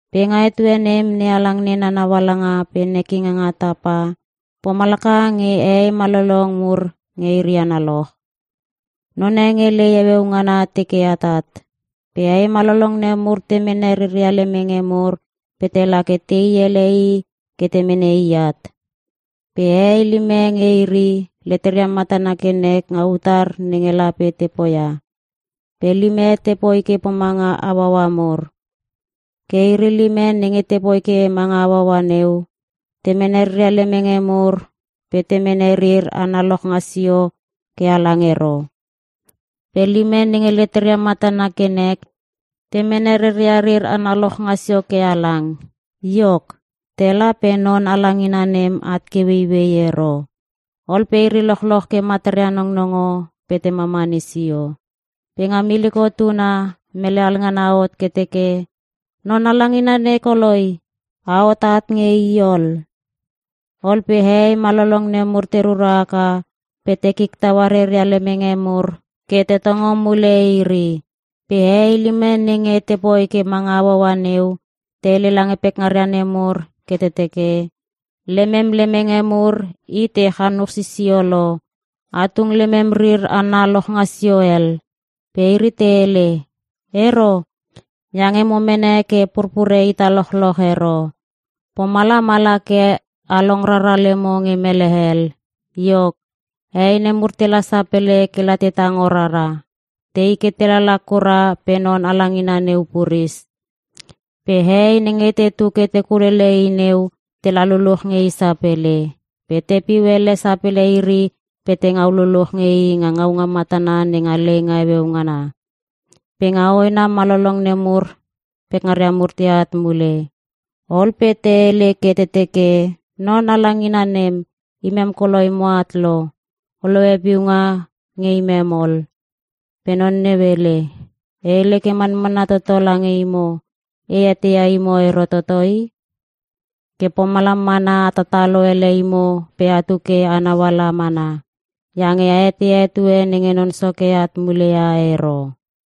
“Pe nga etue nem NeHalang nena naualanga pe nekinga nga tapa, pomalaka nge hehei malolong mur nge iri analoch. None nge lei heueu ngana teke atat, pe hehei malolong nemur te mene reria lemenge mur pe tela ke tei ele i ke te mene i at. Pe hehei lime nge iri, leteria matana ke nek nga utar nenge lape te poia, pe lime te poi ke pomanga hauaua mur. Ke iri lime nenge te poi ke manga hauaua neu, te mene reria lemenge mur pe te mene rir ana lochngasio ke halang ero. Pe lime nenge leteria matana ke nek, te mene reria rir ana lochngasio ke halang. Iok, tela pe non halangina nem at ke ueiuei ero. Ol pe iri lochloch ke mataria nongnongo pe te mamani sio. “Pe nga miliko tuna, mele halngana hot ke teke, ‘Non halangina nei koloi! A hot at nge i ol!’ Ol pe hehei malolong nemur te rura haka pe te kik taua reria lemenge mur ke te tongo mule iri. “Pe hehei lime nenge te poi ke manga hauhaua neu, te hele lange pekngaria nemur ke te teke, ‘Lemem lemenge mur i te chanuch sisio lo. A tung lemem rir ana lochngasio hel.’ “Pe iri te hele, ‘Ero, iange mo mene ke purpure ita lochloch ero. Pomalam ala ke a long rara lemo nge mele hel.’ “Iok, hehei nemur tela sapele kela te tango rara. Tei ke te lala kura pe non halangina neu puris. Pe hehei nenge tetu ke te kulele i neu, tela luluch nge i sapele. Pe te piu ele sapele iri pe te ngau luluch nge i nga ngaunga matana nenga leinga heueu ngana. “Pe nga hoena malolong nemur pekngaria mur teat mule. Ol pe te hele ke te teke, ‘Non halangina nem, imem koloi moat lo. O lohe piunga nge imem ol!’ “Pe non neu hele, ‘E hele ke manmanna toto lange imo, e eteia imo ero toto i.’ “Ke pomalam mana a tatalo ele imo pe atu ke a nauala mana, iange a eteia etue nenge Non Soke at mule ia ero.”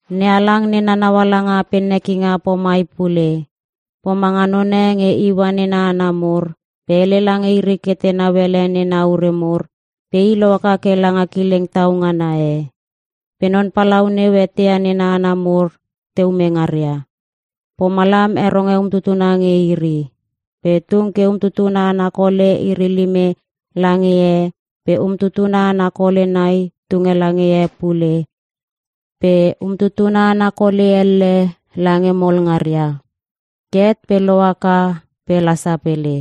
“NeHalang nena naualanga pe nekinga pomai pule. Pomanga none nge iua nena hana mur, pe hele lange iri ke tenau ele nena ure mur, pe i lohaka ke langa kileng tau ngana e. Pe non palau neu eteia nena hana mur te ume ngaria, pomalam heronge umtutuna nge iri. Pe tunge ke umtutuna ana kole iri lime lange e pe umtutuna ana kole nai tunge lange e pule pe umtutuna ana kole elle lange mol ngaria. Ke het pe lohaka pe la sapele.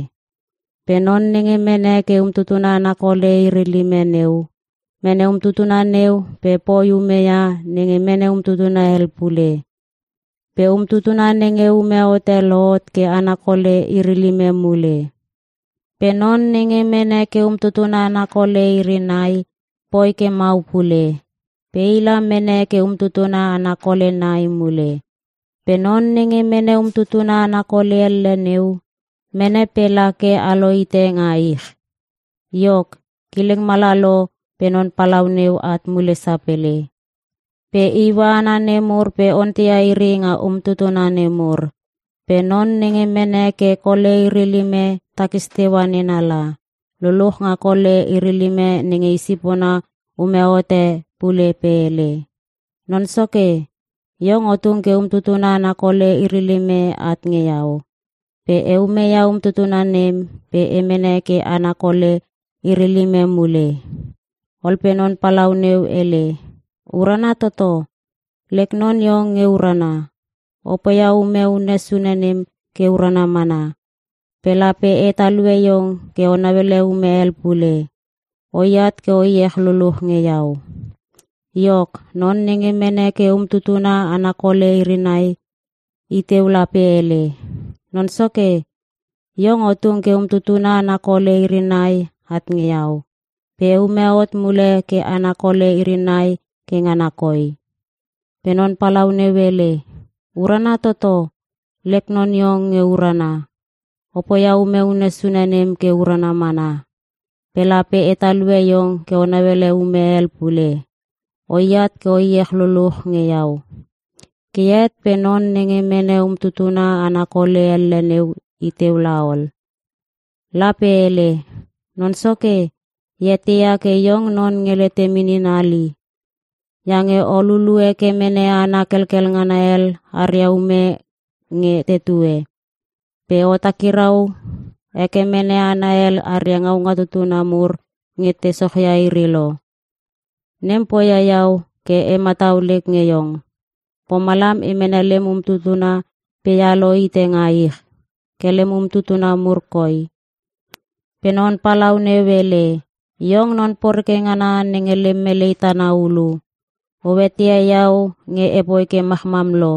“Pe non nenge mene ke umtutuna ana kole iri lime neu, mene umtutuna neu pe poi ume ia nenge mene umtutuna hel pule. Pe umtutuna nenge ume hote lohot ke ana kole iri lime mule. Pe non nenge mene ke umtutuna ana kole iri nai poi ke mau pule. Pe la mene ke umtutuna ana kole nai mule. Pe non nenge mene umtutuna ana kole elle neu, mene pe la ke alohite nga ich. “Iok, kileng mala lo pe non palau neu at mule sapele. Pe iua hana nemur pe onteia iri nga umtutuna nemur. Pe non nenge mene ke kole iri lime takis teua nena la, luluch nga kole iri lime nenge i sipona ume hote pule pe hele, ‘Non soke, iong o tung ke umtutuna ana kole iri lime at nge iau. Pe e ume ia umtutuna nem pe e mene ke ana kole iri lime mule.’ “Ol pe non palau neu hele, ‘Urana toto. Lek non iong nge urana. O poia ume unne sune nem ke urana mana. Pe lape e talue iong ke o nauele ume hel pule. O iat ke o iech luluch nge iau.’ “Iok, non nenge mene ke umtutuna ana kole iri nai, i teu la pe hele, ‘Non soke, iong o tung ke umtutuna ana kole iri nai at nge iau. Pe e ume hot mule ke ana kole iri nai ke ngana koi.’ “Pe non palau neu hele, ‘Urana toto. Lek non iong nge urana. O poia ume unne sune nem ke urana mana. Pe lape e talue iong ke o nauele ume hel pule. O iat ke o iech luluch nge iau.’ “Ke het pe non nenge mene umtutuna ana kole elle neu i teu la ol. La pe hele, ‘Non soke, e eteia ke iong non nge letem inin hali. Iange o lulu heke mene hana kelkel ngana hel aria ume nge tetue. Pe o takirau heke mene hana hel aria ngaunga tutuna mur nge te sochia iri lo. Nem poia iau ke e matau lek nge iong. Pomalam e mene lem umtutuna pe ealo hite nga ich. Ke lem umtutuna mur koi.’ “Pe non palau neu hele, ‘Iong non poreke ngana nenge lem melei tana hulu. O eteia iau nge e poi ke machmam lo.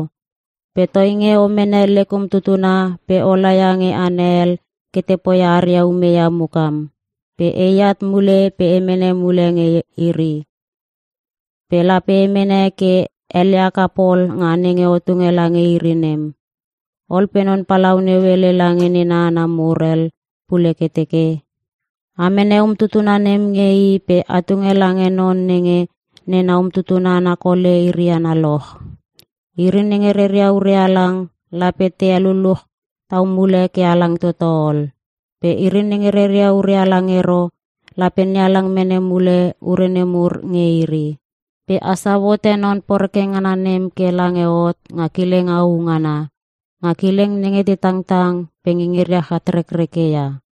Pe toinge o mene lek umtutuna pe o laia nge hana hel ke te poi aria ume ia mukam. Pe e at mule pe e mene mule nge iri. Pe lape e mene ke ele haka pol nga nenge o tunge lange iri nem.’ “Ol pe non palau neu hele lange nena hana mur hel pule ke teke, ‘A mene umtutuna nem nge i pe a tunge lange non nenge nena umtutuna ana kole iri analoch. Iri nenge reria ure halang lape te heluluch tau mule ke halang toto ol. Pe iri nenge reria ure halang ero lape NeHalang mene mule ure nemur nge iri. Pe a sau hote non poreke ngana nem ke lange hot nga kileng au ngana. Nga kileng nenge te tangtang pe ngingiria chatrekreke ia.’”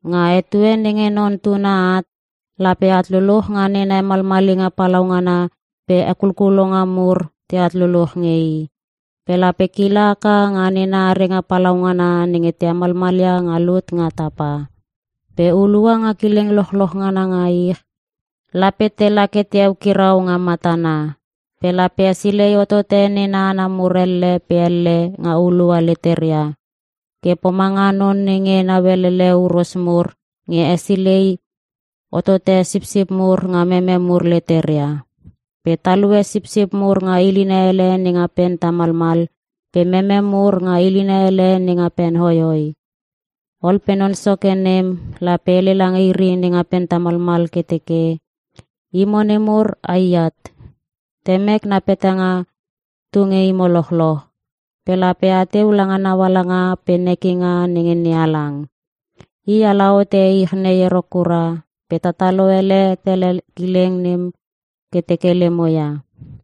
“Nga etue nenge Non Tuna at, lape at luluch nga nena hemalmalinga palaungana pe hekulkulonga mur teat luluch nge I. Pe lape kila haka nga nena arenga palaungana nenge te hemalmalia nga lut nga tapa. Pe hulua nga kileng lochloch ngana nga ich, lape tela ke te eukirau nga matana. Pe lape hesilei hotote nena hana mur elle pe elle nga hulua leteria. Ke pomanga non nenge nauelele huros mur nge hesilei hohote sipsip mur nga meme mur leteria. Pe talue sipsip mur nga ilina hele nenga pen tamalmal pe meme mur nga ilina hele nenga pen hoihoi. “Ol pe Non Soke nem lape hele lange iri nenga pen tamalmal ke teke, ‘Imo nemur a i at. Temek na petanga tu nge imo lochloch, pe lape ateu langa naualanga pe nekinga nenge NeHalang. I ala hote ich nei ero kura pe tatalo ele tele kileng nem ke teke lemo ia.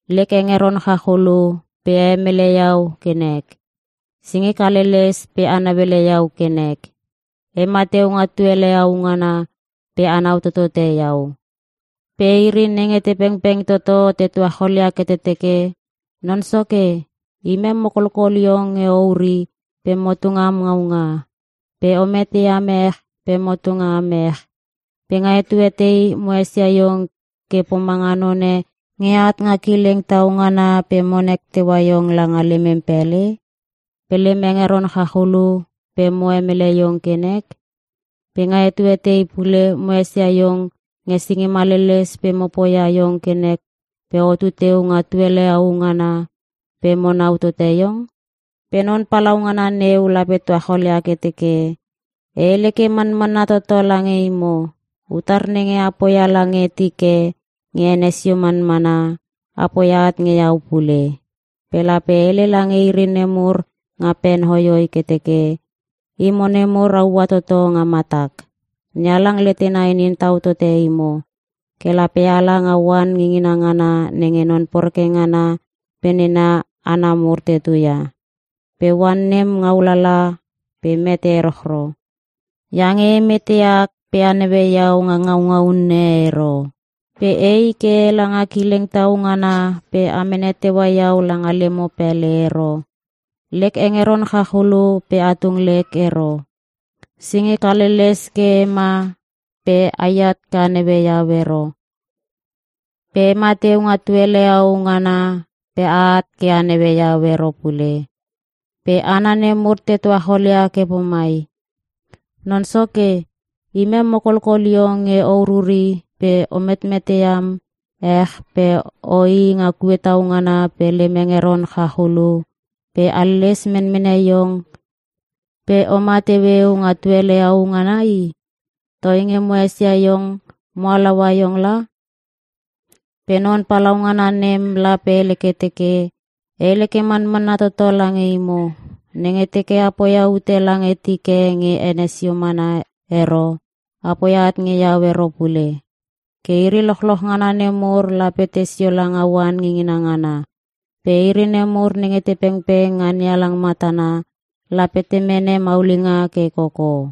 Lek hengeron chachulu pe a hemele iau ke nek. Singik haleles pe a nauele iau ke nek. E ma teu nga tuele au ngana, pe anau totote iau.’ “Pe iri nenge te pengpeng toto te tuacholia ke te teke, ‘Non Soke, imem mo kolkol iong nge o uri pe mo tung am ngaunga. Pe o mete am ech pe mo tung am ech. Pe nga etue tei mo esia iong ke pomanga none nge at nga kileng tau ngana pe mo nek teua iong langa lemem pele? Pe lem hengeron chachulu pe mo hemele iong ke nek? Pe nga etue tei pule mo esia iong nge singim haleles pe mo poia iong ke nek pe otu teu nga tuele au ngana pe mo nau tote iong?’ “Pe Non Palaungana neu lape tuacholia ke teke, ‘E hele ke manmanna toto lange imo, utar nenge a poia lange tik e nge ene sio manmana, a poia at nge Iau pule.’ “Pe lape hele lange iri nemur nga pen hoihoi ke teke, ‘Imo nemur a ua toto nga matak. NeHalang letena inin tau tote imo. Ke lape ala nga oan ngingina ngana nenge non poreke ngana pe nena hana mur te tutu ia. Pe oan nem ngau lala pe mete erochro! Iange e mete ak pe a naue iau nga ngaunga unne ero. Pe ei ke ela nga kileng tau ngana pe a mene teua iau langa lemo pele ero. Lek hengeron chachulu pe a tung lek ero. Singik haleles ke e ma pe a at ke a naue iau ero. Pe e mateu nga tuele au ngana pe a at ke a naue iau ero pule.’ “Pe hana nemur te tuachol ia ke pomai, ‘Non Soke imem mo kolkol iong nge o ururi pe o metmete am ech pe oii nga kue tau ngana pe lem hengeron chach ululu pe haleles menmene iong pe oma teueu nga tuele au ngana i. Toinge mo esia iong, mo halaua iong la.’ “Pe Non Palaungana nem lape hele ke teke, ‘E hele ke manmanna toto lange imo, nenge teke a poia ute lange tik e nge ene sio mana ero, a poia at nge iau ero pule.’ “Ke iri lochloch ngana nemur lape te sio langa oan ngingina ngana. Pe iri nemur nenge te pengpeng nga NeHalang matana, lape te mene maulinga ke koko.”